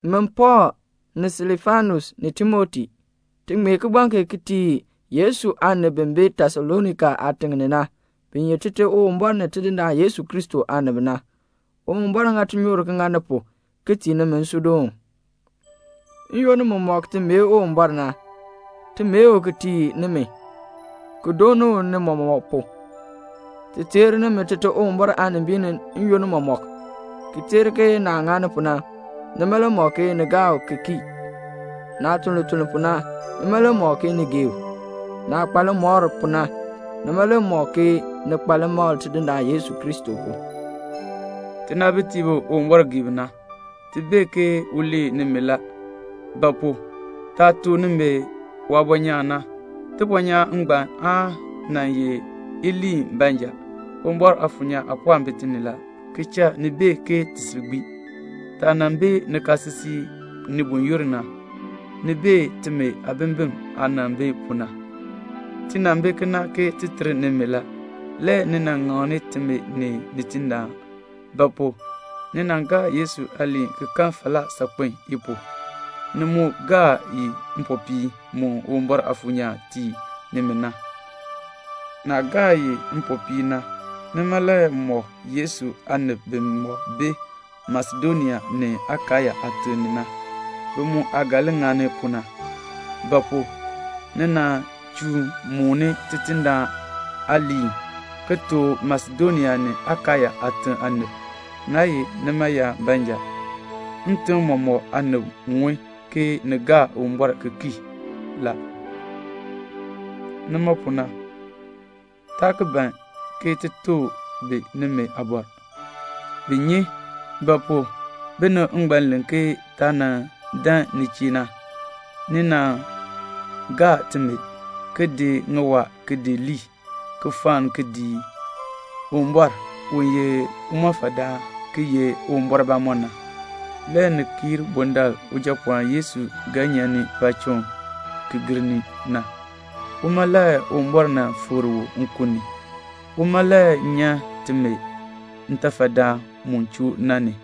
Min Pɔɔl, ni Silfanus ni Timoti, ti ŋmee kigbaŋ kee ti tii Yesu aanib bi bi Tesalonika aatiŋ ni na, bi ye Tite Uwumbɔr ni Tidindaan Yesu Kristo aanib na. Uwumbɔr ŋa tinyoor ki ŋa ni pu, ki tii nimi nsuudoon. N-yoonn mumɔk ti mee Uwumbɔr na, ti mee u ki tii nimi, ki dooni u ni mɔmɔk pu. Ti teer nimi Tite Uwumbɔr aanimbiin ni n-yoonn mɔmɔk, ki teer ke naah ŋani pu na, nima le mɔk ke ni gaa u ki kii; naah tun lituln pu na, nima le mɔk ke ni gee u; naah kpa limɔr pu na, nima le mɔk ke ni kpa limakl Tidindaan Yesu Kristo pu. Tinaabitiib bi Uwumbɔr gee bi na, ti bee ke u lee nimi la; ba pu? taah tuk nimi waabɔnyaan na, tibɔnyaan ngbaan aa nan ye iliin baanja, Uwumbɔr Aafuur nyaan aapɔɔn bi ti ni la, ki cha ni bee ke ti sil gbii. Taah nan bi nikaasisik ni buyoonn na, ni bee timi aabimbin aah nan bi pu na. Ti nan bi kena ke ti ter nimi la. Le ni nan ŋakni timi ni Tidindaan; ba pu? ni gaa Yesu aaliin ki kan falaa saakpen i pu, ni mu gaa i ni mpopiin mu Uwumbɔr Aafuur nyaan tii nimi na. Naah gaa i ni mpopiin na, nima le mɔk Yesu aanib bimɔk bi Masedonia ni Akaya aatim ni na, bi mu aah ga li ŋani pu na; ba pu? ni nan chuun mooni Tidindaan aaliin, ki tuk Masedonia ni Akaya aatim aanib. Naa ye nima yaab baanja, ntim mɔmɔk aanib ŋun ke ni gaa Uwumbɔr ki kii la. Nima pu na, taa ki ban ti tuk bi nimi aabɔr. Bi nyi. Ba pu? binib ngbaan len ke taah nan dan ni chee na, ni nan gaa timi, ki di ŋiwaa ki di lii, ki fenn ki dii Uwumbɔr, u ye limɔfaldaan ki ye Uwumbɔr bamɔnn na, le ni kii bundaln Ujapɔɔn Yesu ga nyan paacham ki gir ni na. Uma le Uwumbɔr nan fikr u nkun ni. Uma le nyan timi ntafadaan mu choo na ni.